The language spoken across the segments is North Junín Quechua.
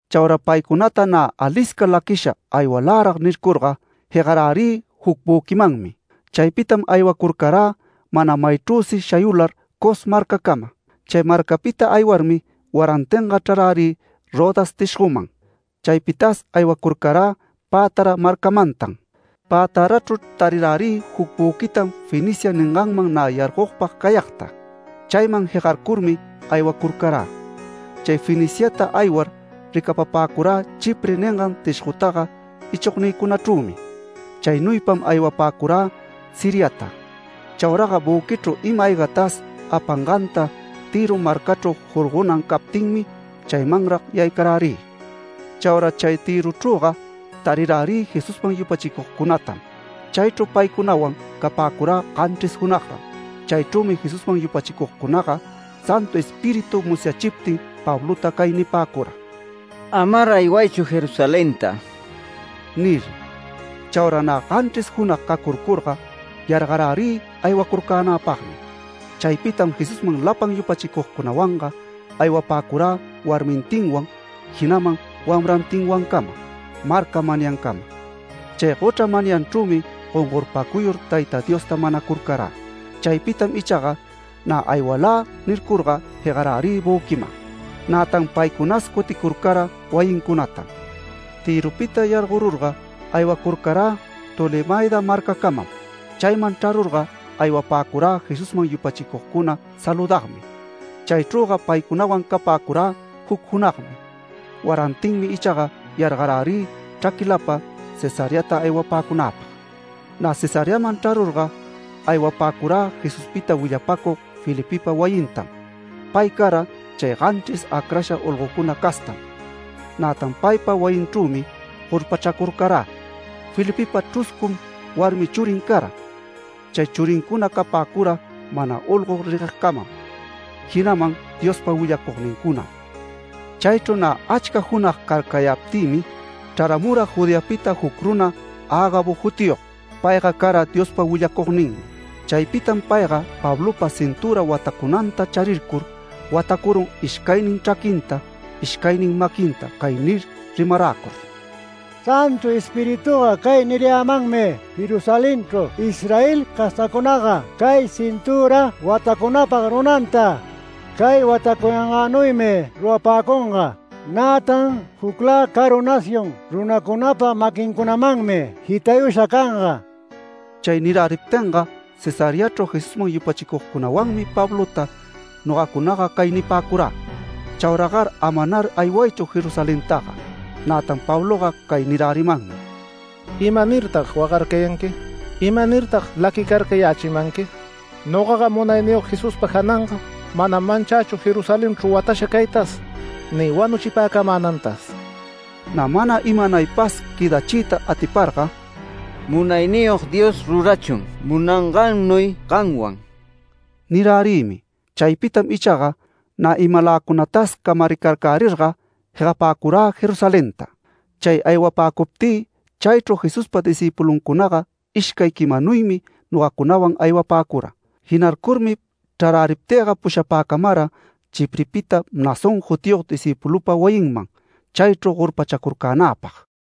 Chaura paycunata nä alisca laquisha “Aywalärag” nircurga, jegarärï juc büquimanmi. Chaypitam aywacurcarä mana maychrüsi shayular Cos marcacama. Chay marcapita aywarmi warantinga chrarärï Rodas tishgoman. Chaypitas aywacurcarä Pátara marcamantan. Pätarachru tarirärï juc büquitam Fenicia ninganman nä yargogpag cayagta. Chayman jegarcurmi aywacurcarä. Chay Feniciata aywar ricapapäcurä Chipre ningan tishgotaga ichognïcunachrümi. Chaynuypam aywapäcurä Siriata. Chauraga büquichru ima-aygatas apanganta, Tïro marcachru jorgonan captinmi, chaymanrag yaycarärï. Chaura chay Tïrochrüga tarirärï Jesusman yupachicugcunatam. Chaychru paycunawan capäcurä ganchris junagran. Chaychrümi Jesusman yupachicugcunaga Santu Espíritu musyachiptin Pablota cay nipäcura: “Amar aywaychu Jerusalenta” nir. Chaura nä ganchris junag cacurcurga, yargarärï aywacurcänäpagmi. Chaypitam Jesusman lapan yupachicugcunawanga aywapäcurä warmintinwan, jinaman wamrantinwancama marca manyancama. Chay gochra manyanchrümi gongorpacuyur Tayta Diosta manacurcarä. Chaypitam ichaga “Nä aywalä” nircurga jegarärï büquiman. Nätan paycunas cuticurcara wayincunatam. Tïropita yargorurga, aywacurcarä Tolemaida marcacamam. Chayman chrarurga aywapäcurä Jesusman yupachicugcuna saludagmi. Chaychrüga paycunawan capäcurä juc junagmi. Warantinmi ichaga yargarärï chraquilapa Cesareata aywapäcunäpag. Nä Cesareaman chrarurga, aywapäcurä Jesuspita willapacug Felipepa wayintam. Pay cara chay ganchris acrasha olgocuna castam. Nätan paypa wayinchrümi gorpachacurcarä. Felipepa chruscum warmi churin cara. Chay churincuna capäcura mana olgo reguegcamam, jinaman Diospa willacugnincunam. Chaychru nä achca junag carcayaptïmi, chraramura Judeapita juc runa Agabo jutiyog. Payga cara Diospa willacugninmi. Chaypitam payga Pablopa cintüra watacunanta charircur, watacurun ishcaynin chraquinta, ishcaynin maquinta cay nir rimaräcur: “Santu Espirituga cay nirayämanmi: ‘Jerusalenchru Israel castacunaga cay cintüra watacunapa runanta, cay watacuyangänuymi rurapäcunga, nätan juclä caru nación runacunapa maquincunamanmi jitayusha canga’”. Chay nirärimaptinga Cesareachru Jesusman yupachicugcunawanmi Pablota nogacunaga cay nipäcurä: “Chauraga amanar aywaychu Jerusalentaga”. Nätan Pabloga cay nirärimanmi: “¿Imanirtag wagarcayanqui? ¿Imanirtag laquicarcayächimanqui? Nogaga Munayniyog Jesuspa jananga manam manchächu Jerusalenchru watasha caytas ni wanuchipäcamänantas”. Nä mana imanaypas quëdachiyta atiparga “Munayniyog Dios rurachun munangannuy gamwan” nirärïmi. Chaypitam ichaga, nä imaläcunatas camaricarcärirga jegapäcurä Jerusalenta. Chay aywapäcuptï, chaychru Jesuspa discïpuluncunaga ishcay quimanuymi nogacunawan aywapäcura. Jinarcurmi chraräriptïga pushapäcamara Chiprepita Mnasón jutiyog discïpulupa wayinman chaychru gorpachacurcänäpag.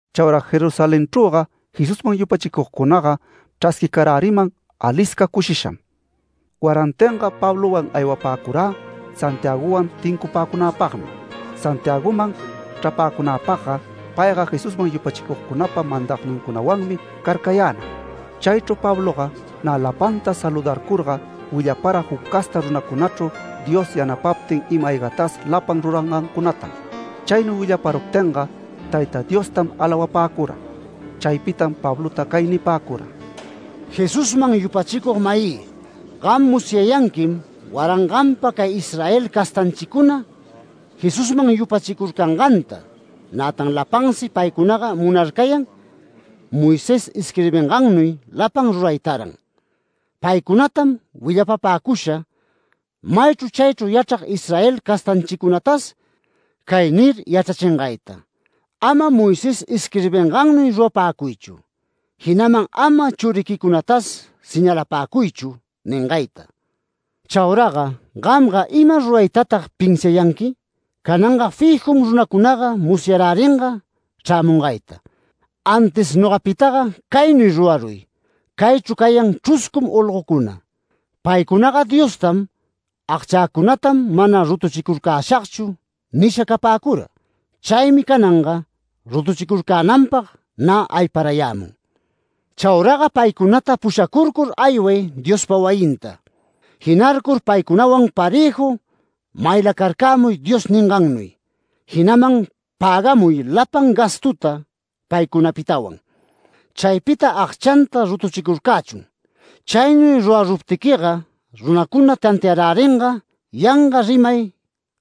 Chaura Jerusalenchrüga Jesusman yupachicugcunaga chrasquicaräriman alisca cushisham. Warantinga Pablowan aywapäcurä Santiagowan tincupäcunäpagmi. Santiagoman chrapäcunäpagga payga Jesusman yupachicugcunapa mandagnincunawanmi carcayänag. Chaychru Pabloga nä lapanta saludarcurga willapara juc casta runacunachru Dios yanapaptin ima-aygatas lapan rurangancunatam. Chaynuy willaparuptinga, Tayta Diostam alawapäcura. Chaypitam Pablota cay nipäcura: “Jesusman yupachicug-mayï, gam musyayanquim waranganpa cay Israel castanchicuna, Jesusman yupachicurcanganta, nätan lapansi paycunaga munarcayan Moisés isquirbingannuy lapan ruraytaran. Paycunatam willapapäcusha maychru chaychru yachrag Israel castanchicunatas cay nir yachrachingayta: ‘Ama Moisés isquirbingannuy rurapäcuychu’, jinaman ‘Ama churiquicunatas señalapäcuychu’ ningayta. Chauraga ¿gamga ima ruraytatag pinsiayanqui? Cananga fijum runacunaga musyaräringa chrämungayta. Antis nogapitaga caynuy ruraruy: Caychru cayan chruscum olgocuna. Paycunaga Diostam ‘Agchäcunatam mana rutuchicurcäshagchu’ nisha capäcura. Chaymi cananga rutuchicurcänanpag nä ayparayämun. Chauraga paycunata pushacurcur ayway Diospa wayinta. Jinarcur paycunawan parëju maylacarcämuy Dios ningannuy, jinaman pägamuy lapan gastuta paycunapitawan. Chaypita agchanta rutuchicurcächun. Chaynuy ruraruptiquiga, runacuna tantiaräringa yanga rimay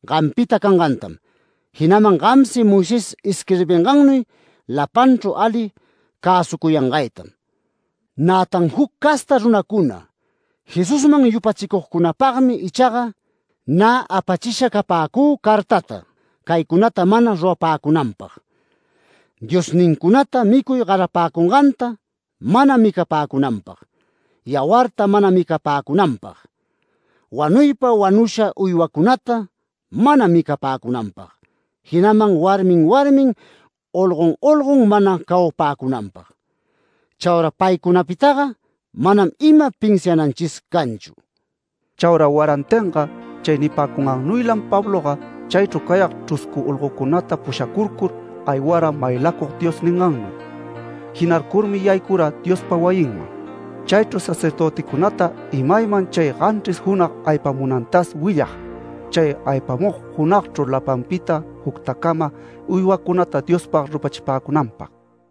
gampita cangantam, jinaman gamsi Moisés isquirbingannuy lapanchru ali cäsucuyangaytam. Nätan juc casta runacuna Jesusman yupachicugcunapagmi ichaga nä apachisha capäcü cartata caycunata mana rurapäcunanpag: diosnincunata micuy garapäcunganta mana micapäcunanpag, yawarta mana micapäcunanpag, wanuypa wanusha uywacunata mana micapäcunanpag, jinaman warmin warmin, olgon olgon mana cawapäcunanpag. Chaura paycunapitaga manam ima pinsiananchis canchu”. Chaura warantinga chay nipäcungannuylam Pabloga chaychru cayag chruscu olgocunata pushacurcur aywara maylacug Dios ningannuy. Jinarcurmi yaycura Diospa wayinman. Chaychru sacerdöticunata imayman chay ganchris junag aypamunantas willag, chay aypamug junagchru lapanpita juctacama uywacunata Diospag rupachipäcunanpag.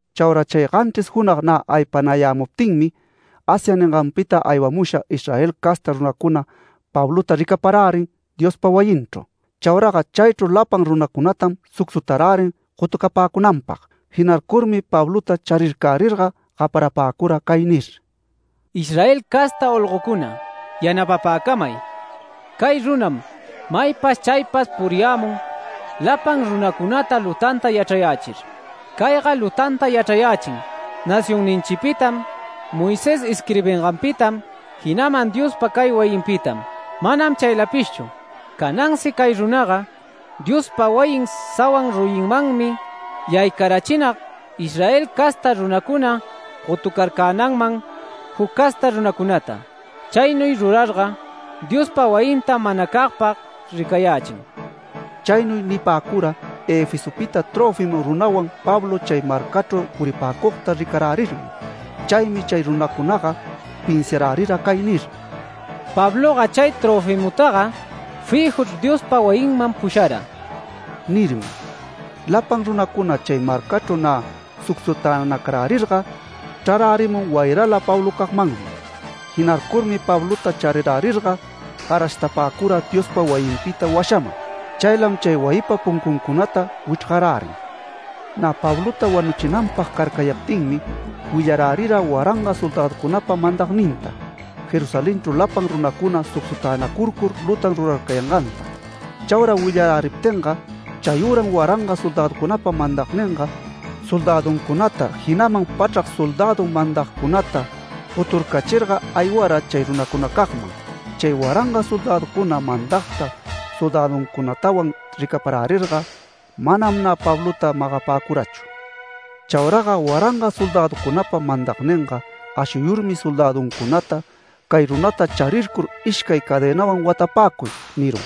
Chaura chay ganchris junag nä aypanayämuptinmi, Asia ninganpita aywamusha Israel casta runacuna Pablota ricaparärin Diospa wayinchru. Chauraga chaychru lapan runatam sucsutarärin gotucapäcunanpag. Jinarcurmi Pablota charircärirga gaparapäcura cay nir: “Israel casta olgocuna yanapapäcamay. Cay runam maypas chaypas puriyämun lapan runacunata lutanta yachrayächir. Cayga lutanta yachrayächin nacionninchipitam, Moisés isquirbinganpitam, jinaman Diospa cay wayinpitam. Manam chaylapishchu; canansi cay runaga Diospa wayin sawan ruyimanmi yaycarachinag Israel casta runacuna gotucarcänanman juc casta runacunata. Chaynuy rurarga Diospa wayintam manacagpag ricayächin”. Chaynuy nipäcura Efesopita Trófimo runawan Pablo chay marcachru puripäcugta ricarärirmi. Chaymi chay runacunaga pinsiarärira cay nir: “Pabloga chay Tröfimotaga fijuchr Diospa wayinman pushara” nirmi. Lapan runacuna chay marcachru nä sucsutänacarcärirga, chrarärimun wayrala Pablocagmanmi. Jinarcurmi Pablota charirärirga garashtapäcura Diospa wayinpita washaman. Chaylam chay wayipa puncuncunata wichrgarärin. Nä Pablota wanuchinanpag carcayaptinmi willarärira waranga soldäducunapa mandagninta, Jerusalenchru lapan runacuna sucsutänacurcur, lutan rurarcayanganta. Chaura willaräriptinga chayüram waranga soldäducunapa mandagninga, soldäduncunata jinaman pachrac soldädu mandagcunata goturcachirga aywara chay runacunacagman. Chay waranga soldäducuna mandagta soldäduncunatawan ricaparärirga, manam nä Pablota magapäcurachu. Chauraga waranga soldäducunapa mandagninga ashuyurmi soldäduncunata “Cay runata charircur ishcay cadenawan watapäcuy” nirun.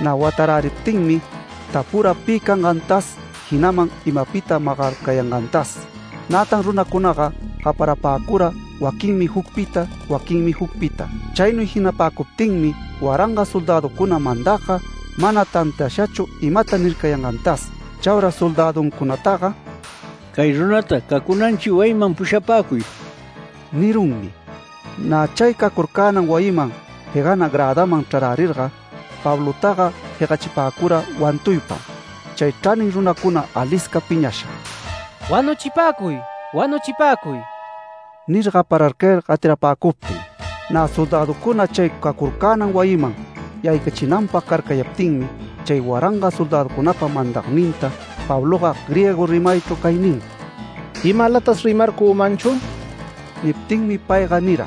Nä wataräriptinmi tapura pi cangantas, jinaman imapita magarcayangantas. Nätan runacunaga gaparapäcura, waquinmi jucpita, waquinmi jucpita. Chaynuy jinapäcuptinmi, waranga soldäducuna mandagga mana tantiashachu imata nircayangantas. Chaura soldäduncunataga “Cay runata cacunanchi wayiman pushapäcuy” nirunmi. Nä chay cacurcänan wayiman jegana grädaman chrarärirga, Pablotaga jegachipäcura wantuypam. Chay chranin runacuna alisca piñasha “Wanuchipäcuy, wanuchipäcuy” nir gapararcayar gatirapäcuptin. Nä soldäducuna chay cacurcänan wayiman yaycachinanpag carcayaptinmi chay waranga soldäducunapa mandagninta Pabloga griego rimaychru cay nin: “¿Imalatas rimarcümanchu?” Niptinmi payga nira: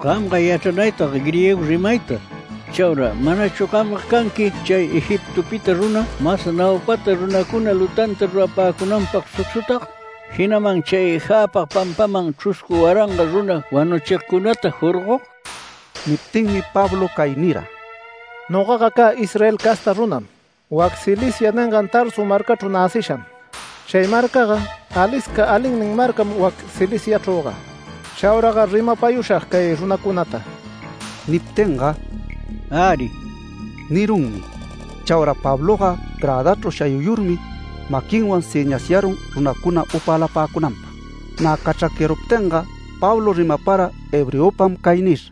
“¡Gamga yachranaytag griego rimayta! Chaura ¿manachu gamga canqui chay Egiptopita runa, mas naupata runacuna lutanta rurapäcunanpag sucsutag, jinaman chay jäpag pampaman chruscu waranga runa wanuchigcunata jorgog?” Niptinmi Pablo cay nira: “Nogaga cä Israel casta runam, wac Cilicia ningan Tarso marcachru näcisham. Chay marcaga alisca alinnin marcam wac Ciliciachrüga. Chauragar rimapayushag cay runacunata”. Niptinga “Äri” nirunmi. Chaura Pabloga grädachru shayuyurmi, maquinwan sëñasyarun runacuna upälapäcunanpag. Nä cachracyaruptinga, Pablo rimapara hebreopam cay nir: